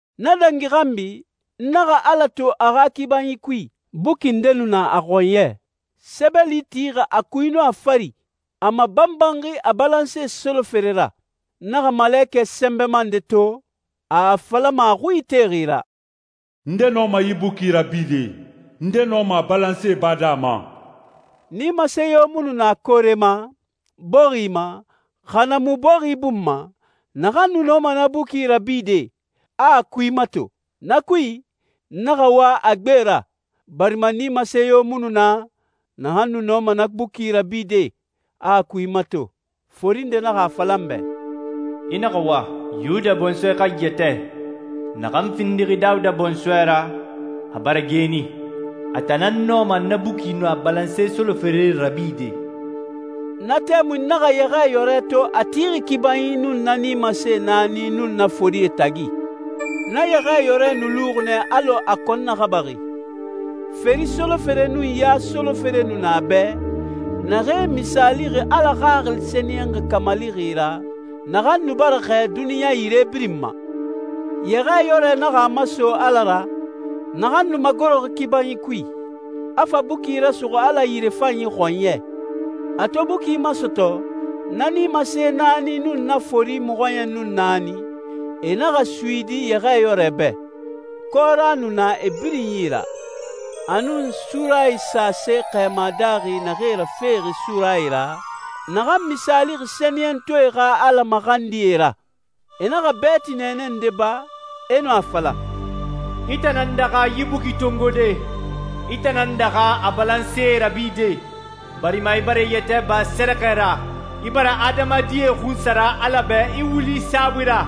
Na dangi xanbi, n naxa Ala to a xa kibanyi kui, buki nde nu na a xɔnyɛ, sɛbɛli tixi a kui nun a fari, a mabalanxi a balanse solofere ra. N naxa malekɛ sɛnbɛma nde to, a a falama a xui itexi ra, «Nde nɔma yi buki rabide, nde nɔma a balansee bade a ma?» Nimase yo mu nu na koore ma, bɔxi ma, xa na mu a ra bɔxi bun ma, naxan nu nɔma na buki rabide, a a kui mato. Na kui, n naxa wa a gbegbe ra, barima nimase yo mu nu na, naxan nu nɔma na buki rabide, a a kui mato. Fori nde naxa a fala n bɛ, «I naxa wa, Yuda bɔnsɔɛ xa yɛtɛ, naxan findixi Dawuda bɔnsɔɛ ra, a bara geeni. A tan nan nɔma na buki nun a balanse solofere rabide.» Na tɛmui n naxa Yɛxɛɛyɔrɛ to a tixi kibanyi nun na nimase naani nun na forie tagi. Na Yɛxɛɛyɔrɛ nu luxi nɛ alɔ a kɔn naxabaxi. Feri solofere nun ya solofere nu na a bɛ, naxee misaalixi Ala Xaxili Sɛniyɛnxi kamalixi ra, naxan nu bara xɛɛ duniɲa yire birin ma. Yɛxɛɛyɔrɛ naxa a maso Ala ra, naxan nu magoroxi kibanyi kui, a fa buki rasuxu Ala yirefanyi xɔnyɛ. A to buki masɔtɔ, na nimase naani nun na fori mɔxɔɲɛn nun naani, e naxa suyidi Yɛxɛɛyɔrɛ bɛ. Kɔra nu na e birin yi ra, a nun surayi sase xɛɛma daaxi naxee rafexi surayi ra, naxan misaalixi sɛniyɛntɔɛe xa Ala maxandie ra. E naxa bɛɛti nɛɛnɛ nde ba, e nu a fala, «I tan nan daxa yi buki tongode, i tan nan daxa a balansee rabide, barima i bara i yɛtɛ ba sɛrɛxɛ ra, i bara adamadie xunsara Ala bɛ i wuli saabui ra,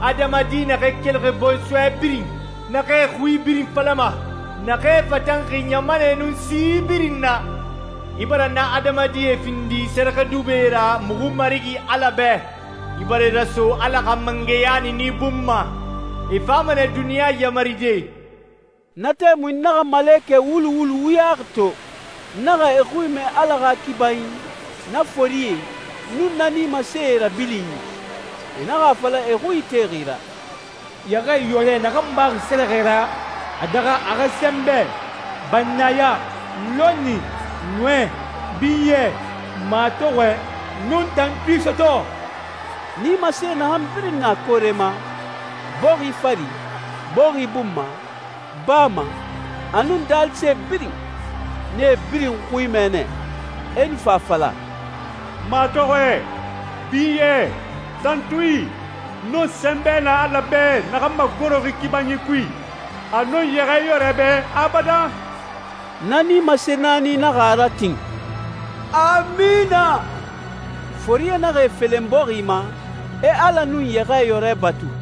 adamadi naxee kelixi bɔnsɔɛ birin, naxee xui birin falama, naxee fatanxi ɲamanɛ nun si birin na. I bara na adamadie findi sɛrɛxɛdubɛe ra muxu Marigi Ala bɛ. I bara e raso Ala xa mangɛya niini bun ma. E fama nɛ duniɲa yamaride.» Na tɛmui n naxa malekɛ wulu wulu wuyaxi to, n naxa e xui mɛ Ala xa kibanyi, na forie, nun na nimasee rabilinyi. E naxa a fala e xui itexi ra, «Yɛxɛɛyɔrɛ naxan baxi sɛrɛxɛ ra, a daxa a xa sɛnbɛ, bannaya, lɔnni, nɔɛ, binyɛ, matɔxɔɛ, nun tantui sɔtɔ.» Nimase naxan birin na koore ma, bɔxi fari, bɔxi bun ma, baa ma, a nun daalise birin, n nee birin xui mɛ nɛ, e nu fa a fala, «Matɔxɔɛ, binyɛ, tantui, nun sɛnbɛ na Ala bɛ naxan magoroxi kibanyi kui, a nun Yɛxɛɛyɔrɛ bɛ abadan.» Na nimase naani naxa a ratin, «Amina.» Forie naxa e felen bɔxi ma, e Ala nun Yɛxɛɛyɔrɛ batu.